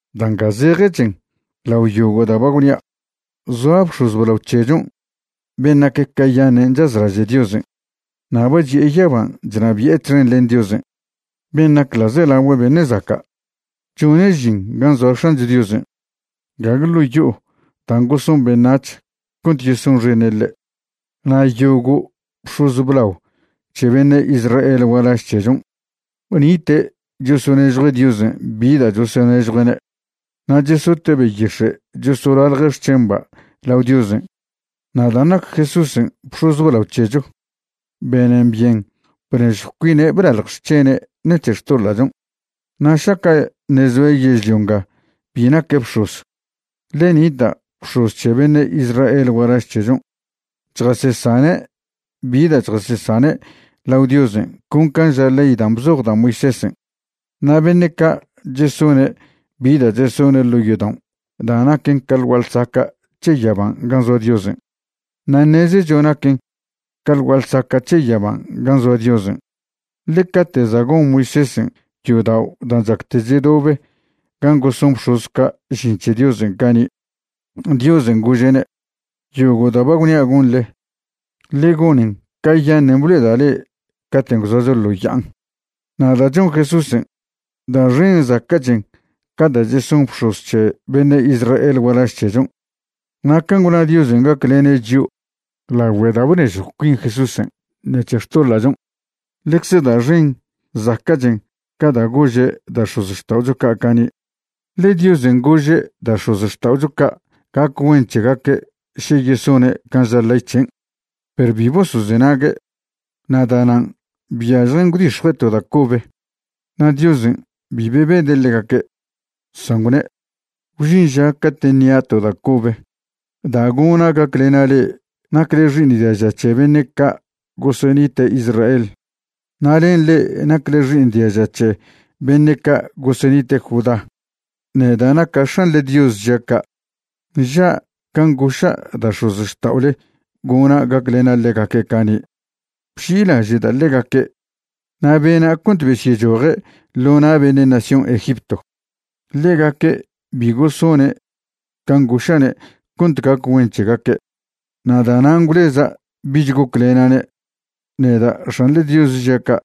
Da' nga zejechen lao yogo' da' ba gwnia': zoa bx̱oz blao c̱hechon' ben' nac cayaṉe' chazlaže' Diosen', na' ba chi'e yaban' chnabi'e txen len Diosen' ben' nac ḻa'zelagüe beṉe' zaca'. Chone' žin gan' zoa X̱ancho Diosen', gague ḻo' yo'o dan' goson beṉac̱h cont yesonxene' ḻe'. Na' yogo' bx̱oz blao c̱he beṉe' Israel gualaž c̱hechon' nite' chosonežjue' Diosen' bi da' chosonežjue'ne' na' chesote' beyix̱e' chosolalje' xc̱hemba' lao Diosen'. Na' dan' nac Jesúsen' bx̱oz blao c̱hecho, benen byen bnežjw cuine' blalj xc̱hene' ṉec̱he xtoḻa'chon'. Na' šaca' ṉe' zoe' yežlio nga bi naque' bx̱oz, ḻe nita' bx̱oz c̱he beṉe' Israel gualaž c̱hechon' chjasesane' bi da' chjasesane' lao Diosen' con can' ža ley dan' bzoj da' Moisésen'. Na' beṉe' ca', chesone' bi da' chesone' ḻo' yodao' da' naquen ca ḻ gua'a ḻsaca' c̱he yaban' gan' zoa Diosen'. Na' ṉezecho naquen ca ḻ gua'a ḻsaca' c̱he yaban' gan' zoa Diosen', ḻe cate' za' gon Moisésen' yodao' dan' chacte chedobe gan' goson bx̱oz ca' žin c̱he Diosen' cani', Diosen' gože'ne': “Yogo' da' ba gwnia' gonḻe, ḻe gonen cayaṉen' blo'eda' le' caten' gwzoacho ḻo ya'an.” Na' da' chon Jesúsen', da' xen zaca'chen ca da' cheson bx̱oz c̱he beṉe' Israel gualaž c̱hechon', na' can' gwna Diosen' gaclene' chio' lagüe da' bnežjw cuin Jesúsen' ṉec̱he xtoḻa'chon', ḻecze da' xen zaca'chen ca dan' gože' da' x̱ozxta'ocho ca' cani'. Ḻe Diosen' gože' da' x̱ozxta'ocho ca' gac güen c̱hegaque' še yesone' can' ža ley c̱hen', perw bi bosozenague', na' da'nan' byažjen gwdix̱jue' to da' cobe. Na' Diosen' bi bebede' ḻegaque', san gwne': Gwžin ža cate' ṉia' to da' cobe da' gona' gaclena' le'e nacle xi'iṉ diaža c̱he beṉe' ca' gosenite' Israel, na' len le'e nacle xi'iṉ diaža c̱he beṉe' ca' gosenite' Judá. Neda' naca' X̱anḻe Dios žia' ca'. Nža' can' goša' da' x̱ozxta'ole gona' gaclena' ḻegaque' cani', bži'ilaže'da' ḻegaque' na' bena' cont besyechoje' ḻo na' beṉe' nación Egipto. Ḻegaque' bi gosone' can' goša'ne' cont gac güen c̱hegaque'. Na' da'nan' gwleza' bich goclena'ne', neda' X̱anḻe Dios žia' ca'.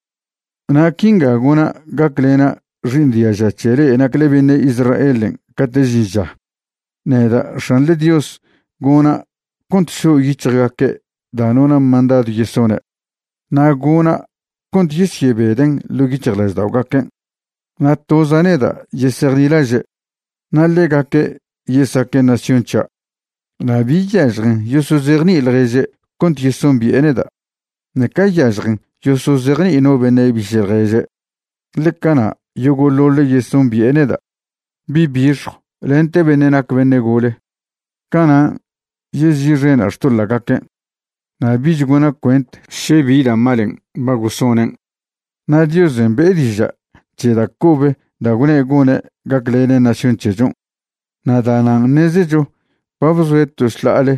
Na' quinga gona' gaclena' xi'iṉ diaža c̱he le'e nacle beṉe' Israelen' cate' žin ža: Neda' X̱anḻe Dios gona' cont šo' yic̱hjgaque' da' nona' mandadw yesone', na' gona' cont yesyebeden' ḻo' yic̱hjlažda'ogaquen', na' toza' neda' yesejnilaže', na' ḻegaque' yesaque' nación c̱hia'. Na' bi yažjen yosozejni'i ḻježe' cont yesombi'e neda', ṉeca yažjen yosozejni'i no beṉe' biše' ḻježe', ḻe cana' yogo'ḻoḻe' yesombi'e neda', bi' bixjw lente beṉe' nac beṉe' gole. Canan' yezi'xena' xtoḻa'gaquen', na' bich gona' cuent še bi da' malen' ba gosonen'. Na' Diosen' be'e diža' c̱he da' cobe da' gwne' gone' gaclene' nación c̱hechon', na' da'nan' ṉezecho ba bzoe' to šḻa'ale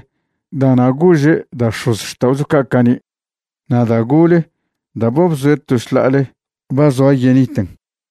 da'na' gože' da' x̱ozxta'ocho ca' cani'. Na' da' gole da' ba bzoe' to šḻa'ale ba zoa yeniten.